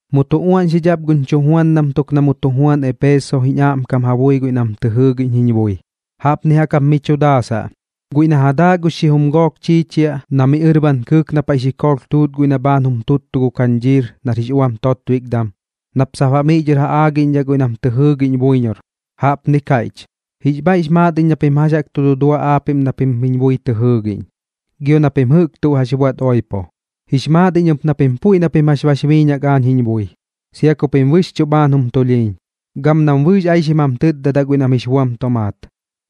’Mu tu uaꞌñxidhaꞌ ap guñ chujuandam tuk na mu tu juan Eepeso jiñ aꞌmkam ja bui guiꞌ nam tɨ jɨɨgiꞌñ jiñ bui. Jaꞌpnip jaꞌk mi chu daasaꞌ: “Guiꞌ na ja daaꞌ gux xijum gook chiichiaꞌ, na miꞌ ɨrban kɨɨk na paiꞌ xikoolh tuut guiꞌ na bhaan jum tuttu gu kañdhiir nar jix uam totbikdam, nap sap baꞌ miꞌ dhɨr ja aagiꞌñdhaꞌ guiꞌ nam tɨ jɨɨgiꞌñ buiñor, jaꞌpni kaiꞌch: Jix bhaiꞌx maat iñ na pim jax jaꞌk tu dudua aapiꞌm na pim jiñ bui tɨ jɨɨgiꞌñ, gio na pim jɨꞌk tuꞌ jax buaꞌt oipo. Jix maat iñ ɨp na pim puiꞌ na pim jax bax biiñak aañ jiñ bui, sia ku pim bɨxchuꞌ bhaan jum tulhiiñ, gam nam bɨɨx aixim jam tɨtdadaꞌ guiꞌ nam jix buam tomaat.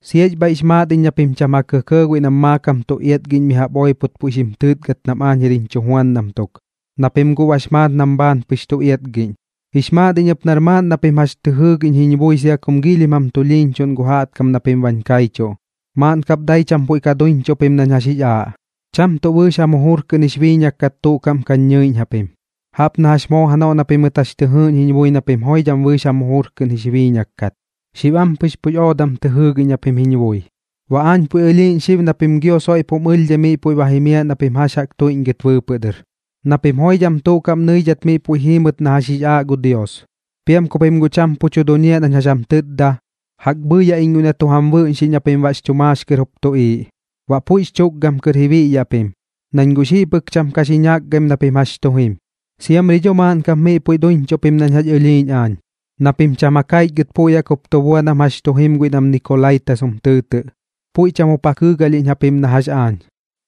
Siax bhaiꞌx maat iñ na pim cham ja kɇkɇɇ guiꞌ nam maakam tu iatgiꞌñ mi jaꞌp oipot puiꞌ xim tɨɨtgɨt nam aañ jir jiñ chujuandam tuk, na pim guꞌ bax maat nam bhaan pɨx tu iatgiꞌñ. Jix maat iñ ɨp nar maaꞌn na pim jax tɨ jɨɨgiꞌñ jiñ bui sia kum giilhim jam tulhiiñchuꞌn gu jaꞌtkam na pim bañ kaichuꞌ. Maaꞌn kap dai cham puiꞌ ka duiñchuꞌ pim nañ jax jix aaꞌ, cham tuꞌ bɨɨx jam jujur kɨꞌn jix biiñak kat tuꞌ kaꞌm kañ ñɨiꞌñ japim, jaꞌp na jax moo janoꞌ na pimɨt jax tɨ jɨɨꞌñ jiñ bui na pim joidham bɨɨx jam jujur kɨꞌn jix biiñak kat. Xib ampɨx puiꞌx oodam tɨ jɨɨgiꞌñ japim jiñ bui. Baꞌ aañ puiꞌ ɨlhiiꞌñ xib na pim gio soiꞌp jum ɨlhdhai miꞌ puiꞌ ba jimiaꞌ na pim jax jaꞌk tuiꞌñgɨt bɨɨpɨꞌ dɨr, na pim joidham tuꞌ kaꞌm nɨidhat miꞌ puiꞌ jiimɨt na jax jix aaꞌ gu Dios. Piam ku pim guꞌ cham pu tu duñiaꞌ nañ jax jam tɨtda, jaꞌk bhɨɨyaꞌ iñ guiꞌ na tu jam bɨꞌñxiꞌñ na pim baꞌx chu maax kɨr jup tuꞌiiꞌ, baꞌ puiꞌx chukgam kɨr ji biꞌyaꞌ pim, nañ guꞌ xiꞌ pɨk cham ka xi ñakgaim na pim jax tu jim. Siamri dho maaꞌn kap miꞌ puiꞌ duiñchuꞌ pim nañ jax ɨlhiiꞌñ aañ, na pim cham ja kaichgɨt puiꞌ jaꞌk jup tu bua nam jax tu jim guiꞌ nam Nikolaitas jum tɨɨtɨꞌ, puiꞌ cham jup ja kɨɨgalhiꞌñ japim na jax aañ.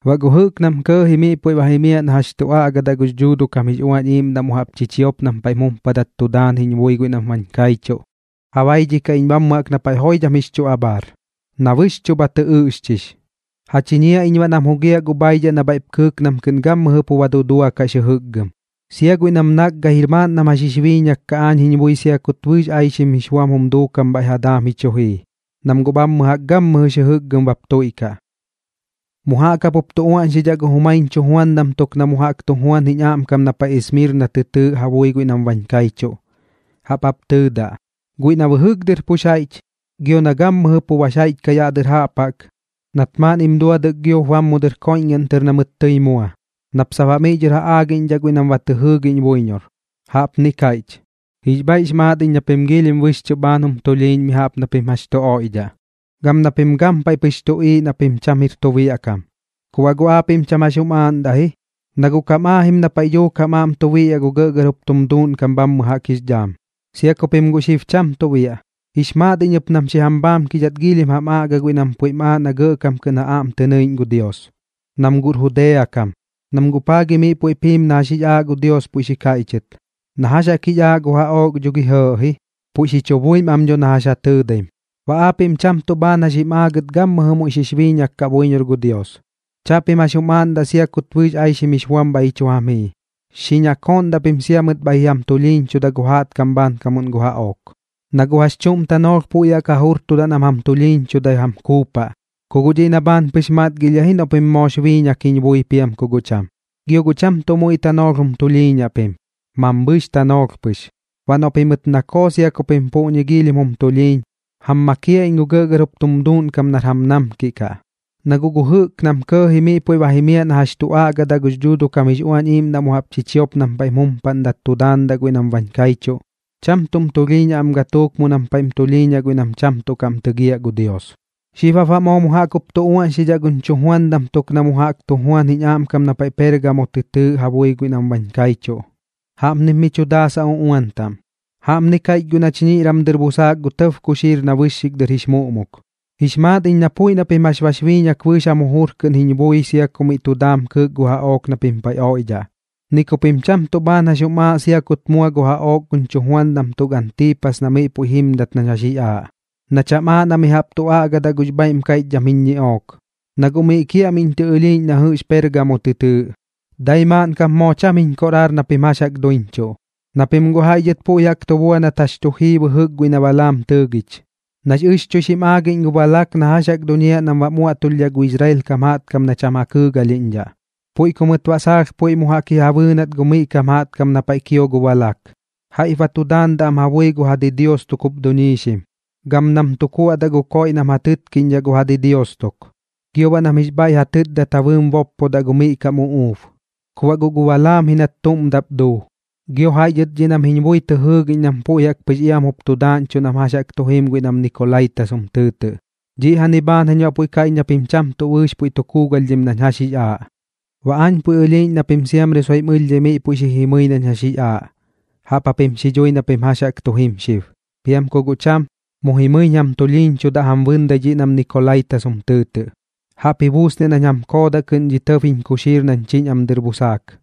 Baꞌ gu jɨꞌk nam kɇɇji miꞌ puiꞌ jimiaꞌ na jax tu aꞌgadaꞌ gux Dhuuduꞌ kam jix Uañ Iiꞌmdaꞌ mu jaꞌp chichiop nam paiꞌm jumpadat tu daan jiñ bui guiꞌ nam bañ kaichuꞌ, ja baidhikaꞌ iñ bhammɨ jaꞌk na paiꞌ joidham jix chu abhaar, na bɨxchuꞌ bha tɨ ɨꞌxchix. Ja chiñiaꞌ iñ baꞌ nam jugiaꞌ gu bhaidhaꞌ na bhaiꞌp kɨɨk nam kɨꞌn gammɨjɨ pu ba duduakaꞌx jɨjɨkgɨm, sia guiꞌ nam nakgair maaꞌn nam jax jix biiñak kaꞌ aañ jiñ bui sia kut jax bɨɨx aixim jix buam jum duukam bhaiꞌ jam daam ji chu jii, nam guꞌ bhammɨ jaꞌk gammɨjɨx jɨjɨkgɨm bap tuiꞌkaꞌ.” ’Mu jaꞌk jap jup tu uaꞌñxidhaꞌ gu jumaiñ chujuandam tuk na mu jaꞌk jup tu juan jiñ aꞌmkam na paiꞌ Esmirna tɨ tɨɨꞌ ja bui guiꞌ nam bañ kaichuꞌ. Jaꞌp jap tɨɨdaꞌ: “Guiꞌ na bɨjɨk dɨr pux jaiꞌch, gio na gammɨjɨ pu bax jaiꞌch kaꞌ yaꞌ dɨr jaꞌp jaꞌk, nat maaꞌnnim duadɨk giop bam mu dɨr koiꞌñgaꞌn tɨr na mɨt tɨi mua, nap sap baꞌ miꞌ dhɨr ja aagiꞌñdhaꞌ guiꞌ nam ba tɨ jɨɨgiꞌñ buiñor, jaꞌpni kaiꞌch: Jix bhaiꞌx maat iñ na pim giilhim bɨxchuꞌ bhaan jum tulhiiñ mi jaꞌp na pim jax tu oiꞌdhaꞌ, gam na pim gampaiꞌ pɨx tuꞌiiꞌ na pim cham jir tu biaꞌ kam. Ku baꞌ guꞌ aapiꞌm cham jax jum aaꞌndaꞌ ji, na guꞌ kam aajim na paiꞌ dhuuk jam aꞌm tu biꞌyaꞌ gu gɇꞌgɇr jup tum duuꞌnkam bhammɨ jaꞌk jix dhaam, sia ku pim guꞌ xib cham tuꞌ biaꞌ. Jix maat iñ ɨp nam xi jam bhaamkidhat giilhim jam aꞌga guiꞌ nam puiꞌm aaꞌ na gɇꞌkam kɨꞌn ja aꞌm tɨ nɨiꞌñ gu Dios, nam guꞌr Judea kam, nam guꞌ paa gi miꞌ puiꞌp jiim na jax jix aaꞌ gu Dios puiꞌ xi kaiꞌchɨt. Na jax jaꞌk jix aaꞌ gu jaꞌook dho gi guꞌ jɇɇꞌ ji, puiꞌ xi chu buim am dho na jax ja tɨɨdaim. Baꞌ aapiꞌm cham tuꞌ bhaan jax jim aagɨt gammɨjɨ muiꞌ xix biiñak kaꞌ buiñor gu Dios. Chaꞌpim jax jum aaꞌndaꞌ sia kut bɨɨx aixim jix buam bhaiꞌ ji chu jam jii. Xi ñakooꞌndaꞌ pim sia noꞌ mɨt bhaiꞌ ji jam tulhiiñchuda gu jaꞌtkam bhaankamuꞌn gu jaꞌook, na guꞌ jax chuꞌm tanoolh puiꞌ jaꞌk ja jurtudaꞌ nam jam tulhiiñchudai jam kuupaꞌ, ku guꞌ dhiꞌ na bhaan pɨx matgilhiaꞌ ji noꞌ pim moox biiñak jiñ bui piam ku guꞌ cham. Gio guꞌ cham tuꞌ muiꞌ tanoolh jum tulhiiñaꞌ pim, mambhɨɨx tanoolh pɨx. Baꞌ noꞌ pimɨt nakoo sia ku pim puꞌñi giilhim jum tulhiiñ, jam makiaꞌ iñ gu gɇꞌgɇr jup tum duuꞌnkam nar jam namkiꞌ kaꞌ. Na guꞌ gu jɨꞌk nam kɇɇji miꞌ puiꞌ jimiaꞌ na jax tu aꞌgadaꞌ gux Dhuuduꞌ kam jix Uañ Iiꞌmdaꞌ mu jaꞌp chichiop nam paiꞌm jumpadat tu daandaꞌ guiꞌ nam bañ kaichuꞌ, cham tuꞌm tulhiiñaꞌ am gatuuk mu nam paiꞌm tulhiiñaꞌ guiꞌ nam cham tuꞌ kaꞌm tɨgiaꞌ gu Dios.” ’Xib jap baꞌ moo mu jaꞌk jup tu uaꞌñxidhaꞌ guñ chujuandam tuk na mu tu juan jiñ aꞌmkam na paiꞌ Peergamo tɨ tɨɨꞌ ja bui guiꞌ nam bañ kaichuꞌ. Jaꞌpnip mi chu daasaꞌ uꞌuan taꞌm: “Jaꞌpni kaiꞌch guiꞌ na chiñiꞌram dɨr busaak gu tɇb kuxiir na bɨxxik dɨr jix muꞌmuk: Jix maat iñ na puiꞌ na pim jax bax biiñak bɨɨx jam jujur kɨꞌn jiñ bui sia ku miꞌ tu daam kɨɨk gu jaꞌook na pim paiꞌ oiꞌdhaꞌ, ni ku pim cham tuꞌ bhaan jax jum aaꞌ sia kut mua gu jaꞌook guñ chujuandam tuk Antiipas na miꞌ puiꞌ jimdat nañ jax jix aaꞌ, na cham aaꞌ na mi jaꞌp tu aꞌgadaꞌ gux bhaiꞌm kaiꞌchdham jiñ ñiꞌook, na guꞌ miꞌ kiaꞌmiꞌñ tɨ ɨlhiiꞌñ na jɨꞌx Peergamo tɨ tɨɨꞌ. Dai maaꞌn kap moo cham jiñ koꞌraar na pim jax jaꞌk duiñchuꞌ, na pim guꞌ jaiꞌ dhɨt puiꞌ jaꞌk tu bua nat jax tu jii bɨjɨk guiꞌ na Balaam tɨɨgich, nax ɨxchuixim aagiꞌñ gu Balak na jax jaꞌk duñiaꞌ nam baꞌm uaꞌtulhdhaꞌ gu Israel kam jaꞌtkam na cham ja kɨɨgalhiꞌñdhaꞌ. Puiꞌ ku mɨt baꞌ saalh puiꞌ mu jaꞌk ji ja bɨɨnat gu miꞌ kam jaꞌtkam na paiꞌ kio gu Balak, jaiꞌp ba tu daandaꞌ am ja bui gu ja didios tuk jup duñiixim, gam nam tu kuaꞌdaꞌ gu koiꞌ nam ja tɨtkiꞌñdhaꞌ gu ja didios tuk, gio baꞌ nam jix bhaiꞌ ja tɨtdat ja bɨɨm boppodaꞌ gu miꞌ kam uꞌuub. Ku baꞌ guꞌ gu Balaam ji nat tuꞌm daꞌp duu. Gio jaiꞌ dhɨt dhiꞌ nam jiñ bui tɨ jɨɨgiꞌñ nam puiꞌ jaꞌk pɨx iam jup tu daaꞌñchuꞌ nam jax tu jim guiꞌ nam Nikolaitas jum tɨɨtɨꞌ. Dhiꞌjani bhaan jañ baꞌ puiꞌ kaiꞌch na pim cham tuꞌ bɨɨx puiꞌ tu kuugalhdhim nañ jax jix aaꞌ. Baꞌ aañ puiꞌ ɨlhiiꞌñ na pim siamri soiꞌm ɨlhdhai miꞌ puiꞌ xi jimɨi nañ jax jix aaꞌ, jaꞌp japim xi dhui na pim jax jaꞌk tu jim xib. Piam ku guꞌ cham, mu jimɨiñ jam tulhiiñchudaꞌ jam bɨndai dhiꞌ nam Nikolaitas jum tɨɨtɨꞌ. Jaꞌp ji buusniaꞌ nañ jam koodaꞌ kɨꞌn dhi tɇb jiñ kuxiir nañ chiñ am dɨr busaak.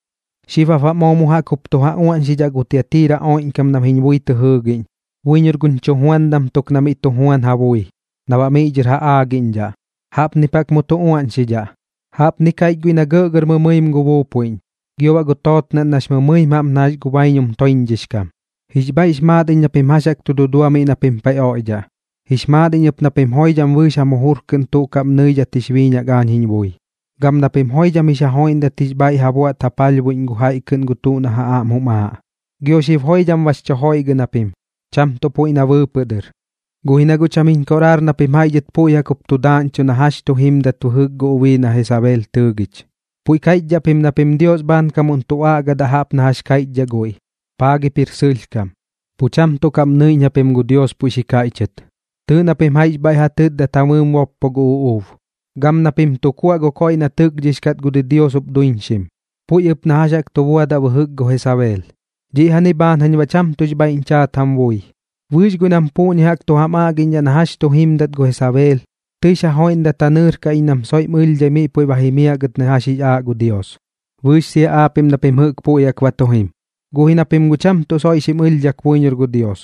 ’Xib jap baꞌ moo mu jaꞌk jup tu ja uaꞌñxidhaꞌ gu Tiatira oiꞌñkam nam jiñ bui tɨ jɨɨgiꞌñ, buiñor guñ chujuandam tuk na miꞌ tu juan ja bui, na baꞌ miꞌ dhɨr ja aagiꞌñdhaꞌ. Jaꞌpnip jaꞌk mu tu uaꞌñxidhaꞌ: “Jaꞌpni kaiꞌch guiꞌ na gɇꞌgɇr mɨmɨim gu buupuiꞌñ, gio baꞌ gu tootnaꞌn nax mɨmɨim jaꞌp na jax gu baiñum toiñdhichdhix kam: Jix bhaiꞌx maat iñ na pim jax jaꞌk tu dudua miꞌ na pim paiꞌ oiꞌdhaꞌ. Jix maat iñ ɨp na pim joidham bɨɨx jam jujur kɨꞌn tuꞌ kaꞌm nɨidhat jix biiñak aañ jiñ bui, gam na pim joidham jix ja joiꞌndat jix bhaiꞌ ja buaꞌt ja palhbuiꞌñ gu jaiꞌ kɨꞌn gu tuꞌ na ja aꞌm jum aaꞌ. Gio xib joidham bax chu joiꞌgɨꞌn japim, cham tuꞌ puiꞌ na bɨɨpɨꞌ dɨr. Guꞌ ji na guꞌ cham jiñ koꞌraar na pim jaiꞌ dhɨt puiꞌ jaꞌk jup tu daaꞌñchuꞌ na jax tu jimdat bɨjɨk gu ubii na Jesabeel tɨɨgich, puiꞌ kaiꞌchdhaꞌ pim na pim Dios bhaankamuꞌn tu aꞌgadaꞌ jaꞌp na jax kaiꞌchdhaꞌ guiꞌ. Paa gip jir sɨlhkam, pu cham tuꞌ kaꞌm nɨiꞌñ japim gu Dios puiꞌ xi kaiꞌchɨt. Tɨɨꞌ na pim jaiꞌx bhaiꞌ ja tɨtdat ja bɨɨm boppo gu uꞌuub, gam na pim tu kuaꞌ gu koiꞌ na tɨkdhix kat gu didios jup duñiixim, puiꞌ ɨp na jax jaꞌk tu buadaꞌ bɨjɨk gu Jesabeel. Dhiꞌjani bhaan jañ baꞌ cham tuꞌx bhaiꞌñ chaat jam bui. Bɨɨx guiꞌ nam puꞌñi jaꞌk tu jam aꞌgiꞌñdhaꞌ na jax tu jimdat gu Jesabeel, tɨix ja joiꞌndat ja nɨɨrkaꞌ iñ nam soiꞌm ɨlhdhai miꞌ puiꞌ ba jimiaꞌ gɨt na jax jix aaꞌ gu Dios, bɨɨx sia aapiꞌm na pim jɨꞌk puiꞌ jaꞌk ba tu jim. Guꞌ ji na pim guꞌ cham tuꞌ soiꞌ xim ɨlhdhak buiñor gu Dios,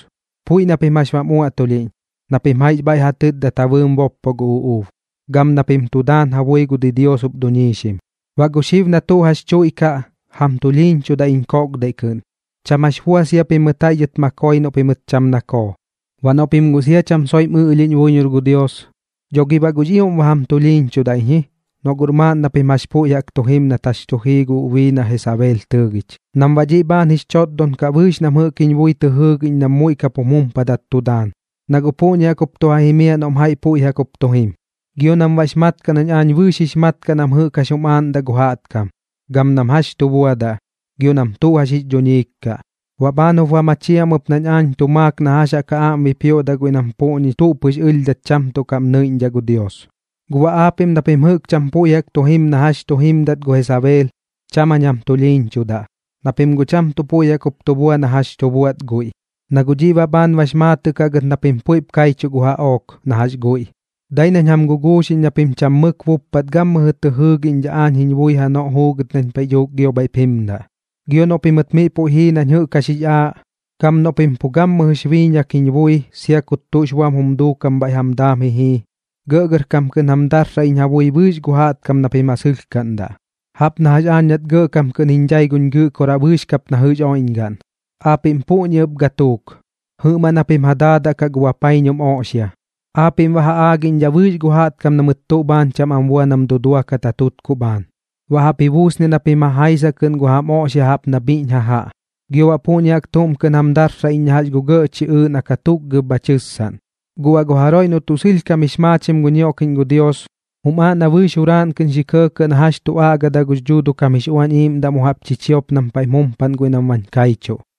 puiꞌ na pim jax bam uaꞌtulhiꞌñ, na pim jaiꞌx bhaiꞌ ja tɨtdat ja bɨɨm boppo gu uꞌuub, gam na pim tu daan ja bui gu didios jup duñiixim. Baꞌ gu xib na tuꞌ jax tuiꞌkaꞌ, jam tulhiiñchudaꞌ iñ koꞌkdaiꞌ kɨꞌn, cham jax bua sia pimɨt jaiꞌ dhɨt ma koi noꞌ pimɨt cham nakoo. Baꞌ noꞌ pim guꞌ sia cham soiꞌm ɨꞌlhiꞌñ buiñor gu Dios, dho gi baꞌ guꞌx ioꞌm ba jam tulhiiñchudaꞌñ ji, noꞌ guꞌr maaꞌn na pim jax puiꞌ jaꞌk tu jim nat jax chu jii gu ubii na Jesabeel tɨɨgich, nam baꞌ dhiꞌ bhaan jix chotdon kaꞌ bɨɨx nam jɨꞌk jiñ bui tɨ jɨɨgiꞌñ nam muiꞌ kap jum jumpadat tu daan, na guꞌ puꞌñi jaꞌk jup tu ja jimiaꞌ noꞌm jaiꞌ puiꞌ jaꞌk jup tu jim. Gio nam baꞌx mat kaꞌ nañ aañ bɨɨx jix mat kaꞌ nam jɨꞌk jax jum aaꞌndaꞌ gu jaꞌtkam, gam nam jax tu buadaꞌ, gio nam tuꞌ jax jix dhuñiik kaꞌ. Baꞌ bhaan jup ba machiaꞌ am ɨp nañ aañ tu maak na jax jaꞌk ja aꞌm bipioꞌdaꞌ guiꞌ nam puꞌñi tuꞌ pɨx ɨlhdhat cham tuꞌ kaꞌm nɨiꞌñdhaꞌ gu Dios. Guꞌ baꞌ aapiꞌm na pim jɨꞌk cham puiꞌ jaꞌk tu jim na jax tu jimdat gu Jesabeel, cham jañ jam tulhiiñchudaꞌ, na pim guꞌ cham tuꞌ puiꞌ jaꞌk jup tu bua na jax tu buaꞌt guiꞌ, na guꞌ dhiꞌ baꞌ bhaan bax maatɨꞌ kaꞌ gɨt na pim puiꞌp kaichuꞌ gu jaꞌook na jax guiꞌ. Dai nañ jam guguuxiꞌñ na pim cham mɨk buppat gammɨjɨ tɨ jɨɨgiꞌñdhaꞌ aañ jiñ bui janoꞌ juugɨt nañ paiꞌ dhuuk gio bhaiꞌp jimdaꞌ. Gio noꞌ pimɨt miꞌ puiꞌ jii nañ jɨꞌk jax jix aaꞌ, gam noꞌ pim pu gammɨjɨx biiñak jiñ bui sia kut tuꞌx buam jum duukam bhaiꞌ jam daam ji jii, gɇꞌgɇrkam kɨꞌn jam darsaꞌ iñ ja bui bɨɨx gu jaꞌtkam na pim ja sɨlhkaꞌndaꞌ, jaꞌp na jax aañ nat gɇꞌkam kɨꞌn jiñ dhai guñ Gɨꞌkoraꞌ bɨɨx kap na jɨꞌx oiꞌñgaꞌn. Aapiꞌm puꞌñi ɨp gatuuk, jɨꞌmaꞌn japim ja daadaꞌ kaꞌ gu bapaiñum oꞌxia, aapiꞌm baꞌ ja aagiꞌñdhaꞌ bɨɨx gu jaꞌtkam na mɨt tuꞌ bhaan cham am bua nam duduakat ja tutkuꞌ bhaan, baꞌ jaꞌp ji buusniaꞌ na pim ja jaisaꞌ kɨꞌn gu jam oꞌxia jaꞌp na bhiꞌñ jajaꞌ. Gio baꞌ puꞌñi jaꞌk tuꞌm kɨꞌn jam darsaꞌ iñ na jax gu gɇꞌ chiꞌɨɨꞌ na katukgab bha tɨssaꞌn. Gu baꞌ gu jaroiꞌ noꞌ tuꞌ sɨlhkam jix maachim gu ñioꞌkiꞌñ gu Dios, jum aaꞌ na bɨɨx juraaꞌn kɨꞌn xi kɇɇkɇꞌ na jax tu aꞌga gux Dhuuduꞌ kam jix Uañ Iiꞌmdaꞌ mu jaꞌp chichiop nam paiꞌm jumpaꞌn guiꞌ nam bañ kaichuꞌ.”